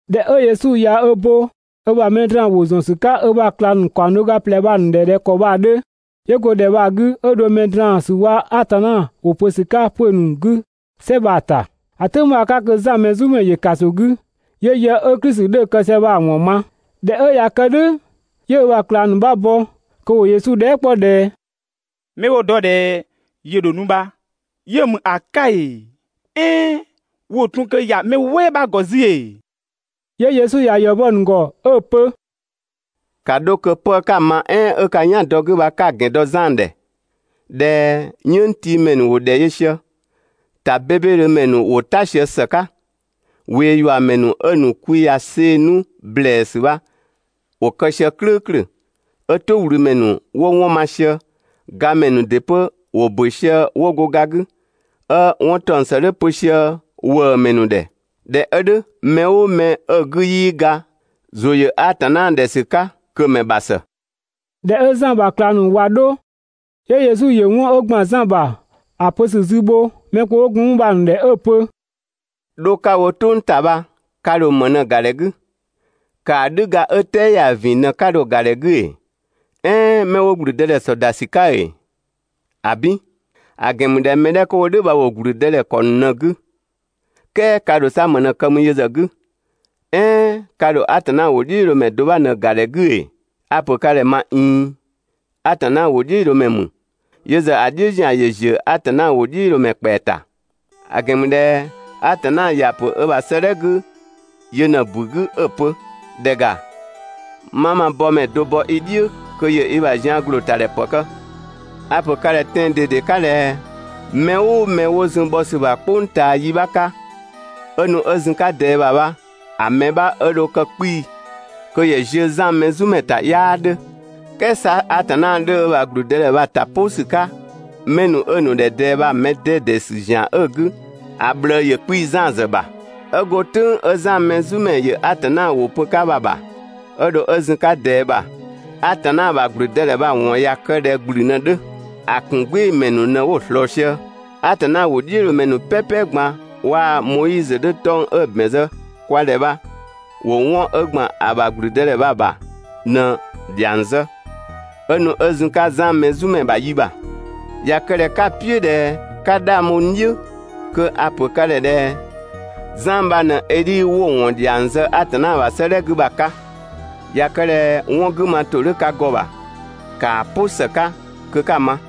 ꞊Dhɛ 'ö Yesu ꞊ya ö bo ö ‑bha mɛ draan‑ ‑wʋ ‑zɔn ‑sü 'ka ö ‑bha ꞊klang ‑nu ‑kaɔng do ga ꞊plɛ bha‑ ‑nu ‑dhɛ ꞊dhɛ ‑kɔ bha‑ 'dhö, 'yö go ‑dhɛ bha‑ 'gü 'ö dho mɛ draan‑ ‑sü waa‑ Atanna ‑wʋ pö ‑sü 'ka 'pö‑ ‑nu 'gü "sɛ bha‑ ‑ta. ‑A "tʋ̈ng bha‑ 'ka kö Zan Mɛzumɛ ‑yö ‑kaso 'gü, 'yö yë 'ö Klisi 'dhö‑ kë sië bha‑ ‑wɔn ma. ꞊Dhɛ 'ö ꞊ya kë "dhʋ̈, 'yö ö ‑bha ꞊klang ‑nu 'bha bɔ kö ‑wo Yesu dhɛɛ" 'kpɔ ꞊dhɛ: «'Mɛ 'wo‑ dɔ ꞊dhɛ ‑yö ‑dho nu bha yö ‑mü ‑a 'ka ‑ee "ɛɛn wo ‑tun ꞊kö ‑ya mɛ "wɛɛ 'bha‑ ‑gɔ 'zü ‑ee?» 'Yö Yesu ‑ya ‑yɔ bɔ‑ ‑nu ‑gɔ 'ö‑ pö: «‑Ka 'dho kö 'pë 'ka‑ ma "ɛɛn 'ö ka "yan dɔ‑ 'gü bha 'ka‑ ‑gɛn dɔ Zan ‑dhɛ ꞊dhɛ "yënngtiimɛ ‑nu ‑wo ‑dhɛ yö sië, ‑ta 'bebedhö ‑mɛ ‑nu ‑wo "ta sië ‑së 'ka, ꞊weeyuamɛ ‑nu 'ö‑ ‑nu kwi ꞊ya see‑ 'nu ‑blɛɛsü bha, ‑wo kë sië "klʋ̈ʋ̈klʋ̈, 'ö "tʋwlümɛ ‑nu 'wo 'wɔn ma sië, gamɛ ‑nu ‑dɩ 'pö ‑wo ‑bö sië 'wo go ga 'gü, 'ö 'wɔn ‑taɔng ‑së 'dhö pö sië ‑wëëmɛ ‑nu ‑dhɛ. ꞊Dhɛ 'ö "dhʋ̈ mɛ "ʋʋ mɛ 'ö‑ 'gü 'yii ga ‑zʋ ‑yö Atanna ‑dhɛ ‑sü 'ka kö‑ ‑mɛ ‑bha ‑së! ꞊Dhɛ 'ö Zan ‑bha ꞊klang ‑nu bha ꞊wa 'dho, 'yö Yesu ‑yö 'wɔn 'ö ‑gban Zan ‑bha ‑a pö ‑sü zü bho mɛ kpö 'wo gun 'mü bha‑ ‑nu ‑dhɛ 'ö‑ pö: «'Dho 'ka‑ wo "tʋng ‑ta bha, ka ‑dho ‑më ꞊në‑ ‑ga ‑dhɛ 'gü? ‑Kaadhüga 'ö "tɛɛ ‑ya ‑vin ꞊në 'ka dho‑ ‑ga ‑dhɛ 'gü ‑ee? "Ɛɛn 'mɛ 'wo ‑gblüdëdhɛ ‑sɔ ‑da ‑sü 'ka ‑ee? ‑Abin! ‑A ‑gɛn ‑mü ꞊dhɛ mɛ 'dhɛ 'kö 'wo "dhʋ̈ bha ‑wo ‑gblüdëdhɛ ‑kɔ ‑nu ꞊në‑ 'gü. "Kɛɛ ka ‑dho 'sa ‑më ꞊në‑ kë mü yö ‑zë 'gü? "Ɛɛn ka ‑dho Atanna ‑wʋdhiʋ̈loomɛ do bha ꞊në‑ ‑ga ‑dhɛ 'gü ‑ee? A‑ ‑pö ka ‑dhɛ ꞊ma ꞊iin, Atanna ‑wʋdhiʋ̈loomɛ ‑mü, yö ‑zë ‑a "dhiʋ̈ ‑zian ‑yö ‑ziö Atanna ‑wʋdhiʋ̈loomɛ ‑kpɛa ‑ta. ‑A ‑gɛn ‑mü ꞊dhɛ Atanna ‑ya ‑pö ö ‑bha 'sëëdhɛ 'gü yö ꞊në‑ ‑bu 'gü 'ö‑ pö: ‹‑Dhɛ ‑ga, 'ma ma bɔmɛ do bɔ i "dhiʋ̈ kö ‑yö i ‑bha zian ‑glootadhɛ ‑pë kë.› A‑ ‑pö ka ‑dhɛ tɛan‑ ꞊dede 'ka ꞊dhɛ mɛ "ʋʋ mɛ 'wo zun bhɔ ‑sü ‑bha "kpʋng ꞊taa yi 'bha 'ka 'ö nu 'ö zun‑ 'ka ꞊dɛɛ ‑bha bha, ‑a mɛ 'bha 'ö dho kë 'kpii‑ kö ‑yö ‑ziö Zan Mɛzumɛ ‑ta 'yaa 'dhö, "kɛɛ 'sa Atanna 'dhö ö ‑bha ‑gblüdëdhɛ bha‑ ‑ta "pʋ ‑sü 'ka 'mɛ 'ö‑ ‑nu ‑dhɛ ꞊dɛɛ bha‑ mɛ 'dɛdɛ ‑sü ‑zian 'ö‑ 'gü ‑a ꞊bhlëë ‑yö 'kpii‑ Zan ‑zë ‑bha. 'Ö go "tʋ̈ng 'ö Zan Mɛzumɛ ‑yö Atanna ‑wʋ pö‑ 'ka bha ‑bha, 'ö dho 'ö zun‑ 'ka ꞊dɛɛ ‑bha, Atanna ‑bha ‑gblüdëdhɛ bha‑ ‑wɔn ꞊ya kë ꞊dhɛ ‑gblü ꞊në‑ 'dhö, ‑a ‑kun "gbɩɩ‑ ‑mɛ ‑nu ꞊në 'wo‑ ꞊slɔɔ sië. Atanna ‑wʋdhiʋ̈loomɛ ‑nu "pɛpɛ ꞊gban waa‑ Moizö 'dhö 'tɔng‑ 'ö‑ ‑bɛn zë kwa ‑dhɛ bha ‑wo 'wɔn 'ö ‑gban ‑a ‑bha ‑gblüdëdhɛ bha‑ ‑bha bha ꞊në‑ ‑dhiang zë 'ö nu 'ö zun‑ 'ka Zan Mɛzumɛ ‑bha yi ‑bha. ꞊Ya kë ꞊dhɛ 'ka‑ "piʋ̈ ꞊dhɛ 'ka 'dhang bho n "dhiʋ̈ kö a‑ ‑pö ka ‑dhɛ ꞊dhɛ: Zan bha ꞊në Edhi 'wo‑ nu ‑wɔn ‑dhiang zë Atanna ‑bha 'sëëdhɛ 'gü bha‑ 'ka. ꞊Ya kë ꞊dhɛ 'wɔn 'gü ma ‑tʋ 'dhö ka ‑gɔ ‑bha, ‑kaa "pʋ ‑së 'ka kö 'ka‑ ma!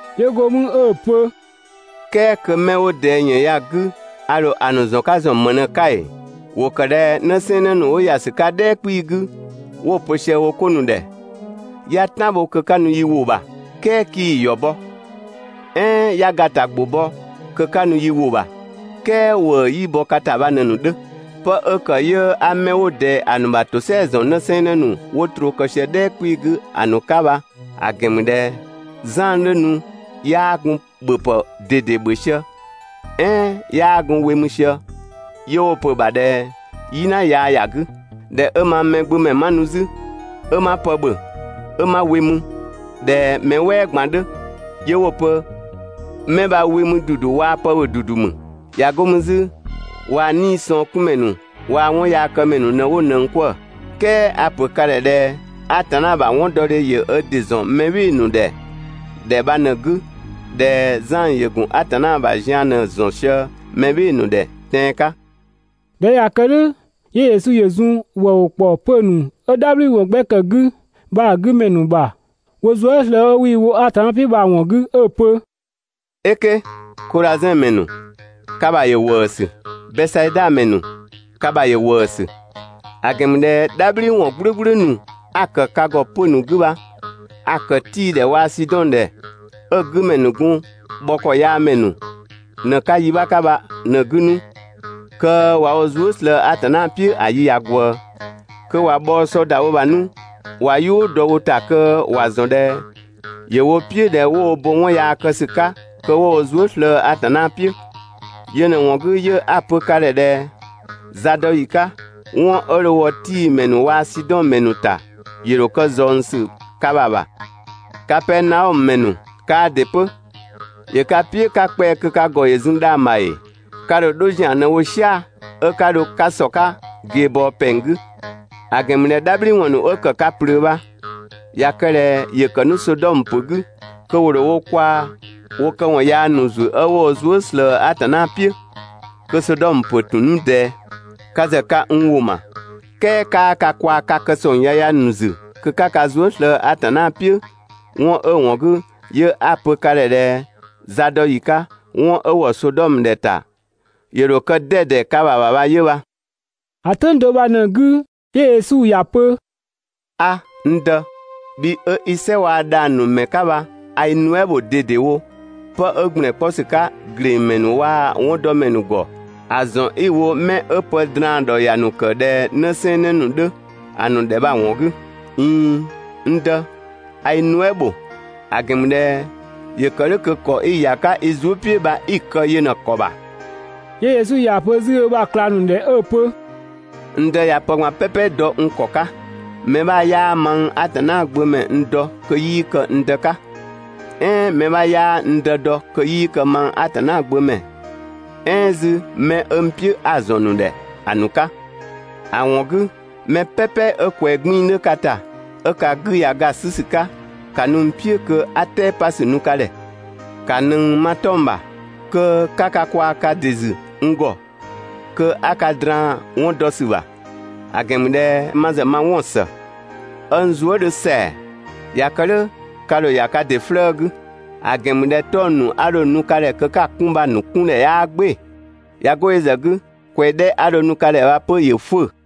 'Yö go mü 'ö‑ pö "kɛɛ kö 'mɛ 'wo ꞊dɛɛ ‑yën ya‑ 'gü ya, a ‑dho ‑a ‑nu ‑zɔn 'ka ‑zɔn ‑më ꞊në‑ 'ka ‑ee? ‑Wo ‑kë ꞊dhɛ 'në 'sɛɛnnë ‑nu 'wo ‑ya ‑sü 'ka "dhɛɛ 'kpii‑ 'gü 'wo‑ pö sië wo 'ko ‑nu ‑dhɛ: «'Ya "tan bho kö 'ka nu yi ‑wʋ ‑bha "kɛɛ 'kii‑ ‑yɔ bɔ. "Ɛɛn 'ya gata ‑gbʋ bɔ kö 'ka nu yi ‑wʋ ‑bha, "kɛɛ ‑wëë 'yii bɔ ka ‑ta bha ꞊në‑ ‑nu 'dhö.» Pë 'ö ‑kë 'yö 'a 'mɛ 'wo ꞊dɛɛ ‑a ‑nu ‑bha ‑tosɛa ‑zɔn 'në 'sɛɛnnë ‑nu 'wo troo kë sië "dhɛɛ 'kpii‑ 'gü ‑a ‑nu 'ka bha, ‑a ‑gɛn ‑mü ꞊dhɛ: Zan 'dhö nu 'yaa gun ‑bhöpë ꞊dede ‑bhö sië "ɛɛn 'yaa gun we mü sië 'yö 'wo‑ pö‑ ‑bha ꞊dhɛ: «"Yina yaa ‑ya 'gü!» ꞊Dhɛ 'ö mang Mɛgbömɛ 'ma nu 'zü, 'ö 'ma pë ‑bhö 'ö 'ma we mü ꞊dhɛ mɛ "wɛɛ ꞊gban 'dhö, 'yö 'wo‑ pö: «Mɛ bha we mü ‑dudu waa‑ pë ‑bhö ‑dudu ‑mü. ꞊Ya 'go mü 'zü waa‑ 'niisɔngkunmɛ ‑nu waa‑ 'wɔnyaakëmɛ ‑nu ꞊në 'wo ꞊nëng 'kwëë‑!» "Kɛɛ a‑ ‑pö ka ‑dhɛ ꞊dhɛ Atanna ‑bha 'wɔndɔdhe ‑yö ö ‑dɩ ‑zɔn mɛ "bhɩɩ‑ ‑nu ‑dhɛ ‑dhɛ bha ꞊në‑ 'gü ꞊dhɛ Zan ‑yö ‑gun Atanna ‑bha zian ꞊në‑ ‑zɔn sië mɛ "bhɩɩ‑ ‑nu ‑dhɛ tɛan‑ 'ka.» ꞊Dhɛ 'ö ꞊ya kë "dhʋ̈ 'yö Yesu ‑yö zun ‑wëëwʋ ‑kpɔ 'pö‑ ‑nu 'ö "dhabhliwɔn 'gbɛ ‑kë 'gü bha‑ ‑nu 'gü ‑mɛ ‑nu ‑bha, wo zuë" slëë‑ 'ö 'wii‑ wo Atanna "piʋ̈ bha‑ ‑wɔn 'gü 'ö‑ pö: «"Eke! Kodhazɛn ‑mɛ ‑nu, ka ‑bha ‑yö ‑wëësü, Bɛsaida ‑mɛ ‑nu, ka ‑bha ‑yö ‑wëësü; ‑a ‑gɛn ‑mü ꞊dhɛ "dhabhliwɔn "gblʋ̈gblʋ̈ ‑nu 'a‑ ‑kë ka ‑gɔ 'pö‑ ‑nu 'gü bha a‑ ‑kë Tii‑ ‑dhɛ waa‑ Sidɔn ‑dhɛ ‑nu ('ö‑ 'gü ‑mɛ ‑nu gun bhɔkɔyaamɛ ꞊në‑ 'ka yi 'bha 'ka bha ꞊në‑ 'gü 'nu, kö ꞊wa wo zuë" slëë‑ Atanna "piʋ̈ ‑a yi ꞊ya ꞊gwëë. Kö ꞊wa bhɔɔ sɔ ‑da wo ‑bha 'nu ꞊wa "yʋʋ dɔ wo ‑ta kö ‑wa ‑zɔn ꞊dhɛ ‑yö wo "piʋ̈ ꞊dhɛ 'wo wo bo 'wɔn yaa kë ‑sü 'ka kö 'wo wo zuë" slëë‑ Atanna "piʋ̈. Yö ꞊në‑ ‑wɔn 'gü 'yö 'a‑ pö ka ‑dhɛ ꞊dhɛ: Zadɔyi 'ka, 'wɔn 'ö dho wɔ Tii ‑mɛ ‑nu waa‑ Sidɔn ‑mɛ ‑nu ‑ta, ‑yö ‑dho kë ꞊zɔngsü ka ‑bha ‑bha. Kapɛɛnaɔmö ‑mɛ ‑nu, kaa ‑dɩ 'pö, ‑yö ka "piʋ̈ 'ka kpɛa‑ kö ka ‑gɔ ‑yö zun dhang‑ ‑bha ‑ee? Ka ‑dho 'dho ‑zian ꞊në‑ wo "sia‑ 'ö 'ka dho 'ka ‑sɔ 'ka ꞊geebɔɔ ‑pɛng 'gü. ‑A ‑gɛn ‑mü ꞊dhɛ "dhabhliwɔn ‑nu 'ö ‑kë ka ꞊plöö bha, ꞊ya kë ꞊dhɛ ‑yö ‑kë 'nu Sodɔmö ‑pö 'gü, (kö ‑wo ‑dho wo kwaa‑ wo këwɔn yaa ‑nu ‑zü 'ö 'wo wo zuë" ꞊slëë Atanna "piʋ̈,) kö Sodɔmö ‑pö ‑tun 'nu ꞊dɛɛ. (Ka ‑zë ka n ‑wʋ ‑ma, "kɛɛ 'kaa ka kwaa‑ ka kë ‑sɔng yaya ‑nu ‑zü kö 'ka ka zuë" slëë‑ Atanna "piʋ̈) 'wɔn 'ö‑ ‑wɔn 'gü 'yö 'a‑ pö ka ‑dhɛ ꞊dhɛ zadɔyi 'ka, 'wɔn 'ö ‑wɔ Sodɔmö ‑dhɛta ‑yö ‑dho kë 'dɛdɛ ka ‑bha ‑bha bha 'yö bha.» ‑A "tʋ̈ng do bha ꞊në‑ 'gü 'yö Yesu ‑ya pö: «'A, n Dë, bhi 'ö 'i "sɛ waa‑ dhang‑ ‑nu ‑mɛ 'ka bha a i nuɛ" bho ꞊dedewo 'pë 'ö ‑gblɛn 'kpɔ ‑sü 'ka ‑glengmɛ ‑nu waa‑ 'wɔndɔmɛ ‑nu ‑gɔ ‑a ‑zɔn 'i‑ wo ('mɛ 'ö pë draan‑ ‑dhɔ ‑ya ‑nu ‑kë ꞊dhɛ 'në 'sɛɛnnë ‑nu 'dhö) ‑a ‑nu ‑dhɛ bha‑ ‑wɔn 'gü. ꞊iin, n Dë, a i nuɛ" ‑bho, ‑a ‑gɛn ‑mü ꞊dhɛ ‑yö ‑kë "dhʋ̈ kö ‑kɔ 'i‑ ‑ya 'ka i zuë" "piʋ̈ bha 'i‑ kë yö ꞊në‑ ‑kɔ ‑bha.» 'Yö Yesu ‑ya pö 'zü ö ‑bha ꞊klang ‑nu ‑dhɛ 'ö‑ pö: «N Dë ꞊ya pë ꞊gban "pɛpɛ dɔ n ‑kɔ 'ka. Mɛ 'bha 'yaa mang Atanna gbö ‑mɛ n dɔ kö 'yii kë n Dë 'ka, "ɛɛn mɛ 'bha 'yaa n Dë dɔ kö 'yii kë mang Atanna gbö ‑mɛ "ɛɛn 'zü 'mɛ 'ö n "piʋ̈ 'a‑ ‑zɔn ‑nu ‑dhɛ ‑a ‑nu 'ka. ‑A ‑wɔn 'gü mɛ "pɛpɛ 'ö ꞊kwɛɛ 'gbiin‑ 'dhö ka ‑ta, 'ö ka 'gü ꞊ya ga ‑a 'sü ‑sü 'ka, ‑ka nu n "piʋ̈ kö 'a "tɛɛpasü nu ka ‑dhɛ. ‑Ka ꞊nëng ma 'tɔng‑ ‑bha kö 'ka ka kwaa‑ ka ‑dɩ ‑zü n ‑gɔ, kö 'a ka draan‑ 'wɔn dɔ ‑sü ‑bha; ‑a ‑gɛn ‑mü ꞊dhɛ ma ‑zë ma 'wɔn‑ ‑së, 'ö n zuë" 'dhö ‑sɛa; ꞊ya kë "dhʋ̈ ka ‑dho ‑ya ka ‑dɩ 'flëë‑ 'gü. ‑A ‑gɛn ‑mü ꞊dhɛ 'tɔng‑ ‑nu 'a dho nu ka ‑dhɛ kö 'ka‑ 'kun bha‑ ‑nu 'kundhɛ 'yaa "gbɩɩ‑, ꞊ya 'go yö ‑zë 'gü ꞊kwɛɛ‑ 'dhɛ 'a dho‑ nu ka ‑dhɛ bha 'pö ‑yö 'fʋ̈ʋ̈‑.»